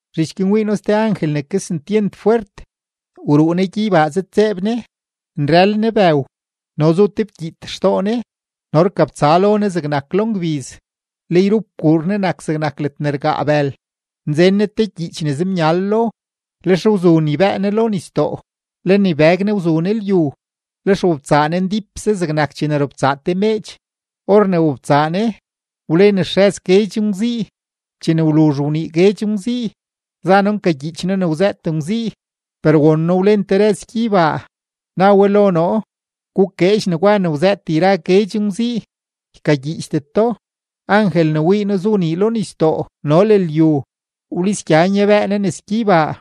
Zhich guin wii noo ste angel ne kesentyent fwert, wruu ne gyeybaa zëdtseeb ne, nrël ne bëw no zu te fkyiit xtoo ne no rkabtsa lo ne zegnak lo ngbiz, le yrup kuur ne nak zegnak ledne rgaa bël. Nzen ne te gyiich ne zemyal lo; lex wzu nibëë ne lo nisdoo, le nibëg ne wzu ne lyu. Lex wobtsaa ne ndípse zegnak chene robtsaa te meedx; or ne wobtsaa ne, wlen xrëz guedx ngwzii. Chene wluzh wnii guedx ngwzii, za noo nkagyiich noo ne wzëët ngwzii, per won noo wlen te rëz gyeybaa, na we lo noo: ―Gukeedx negwa ne wzëët yra guedx ngwzii, ykagyiichdet do. Angel ne wii noo zu nii lo nisdoo no le lyu, wlisgya nyabëë ne nes gyeybaa.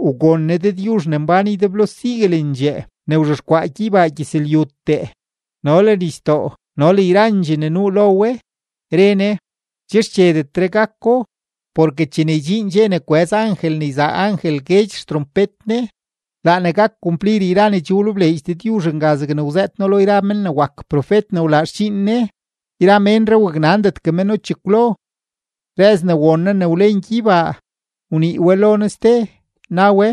Wgon ne Dëdyuzh ne mbán ydeblo siguelendxee. Laa Dëdyuzh wzhexkwaa gyeybaa gyëzlyutee no le nisdoo no le yrandxee ne nuu lo we, re angel guin: ―Che xchedetre gako; porke chene ydxiin dxe ne kwëz angel ne yzaa angel guedx xtrompet ne, laa ne gak kumplir yra ne che wlebleedx Dëdyuzh nga zegne wzëët No lo yra mén ne wak profet ne wlaa xdxiin Ne. Yra neree waknandetgue méno chekwlo. Rëz ne won noo ne wlen gyeybaa, wnii we lo noo ste, na we: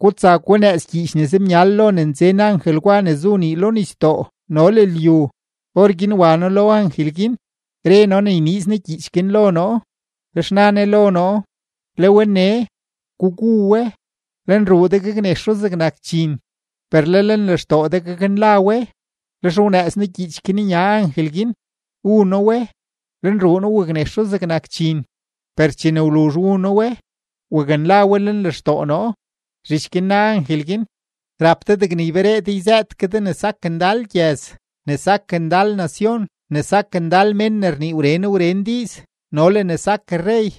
―Gutsa gunëëz gyiich ne zemyal lo ne nzen angel gwa ne zu nii lo nisdoo no le lyu. Orguin wa noo lo angel guin, re noo ne yniiz ne gyiich guin lo noo; lex na ne lo noo: ―Le we nee, gugu we. Lenruu de gaknexo zegnak dxin, per le lenlextoo de gaknla we. Lex wnëëz noo gyiich guin nya angel guin, wu noo we; lenruu noo waknexo zegnak dxin, per chene wluzh wu noo we, waknla we lenlextoo noo. Zhich guin na angel guin: ―Rap de degne yberee de yzëët ke de ne sak ndal gyëz, ne sak ndal nacion, ne sak ndal mén ne rnii wren wren diiz, no le ne sak rrey.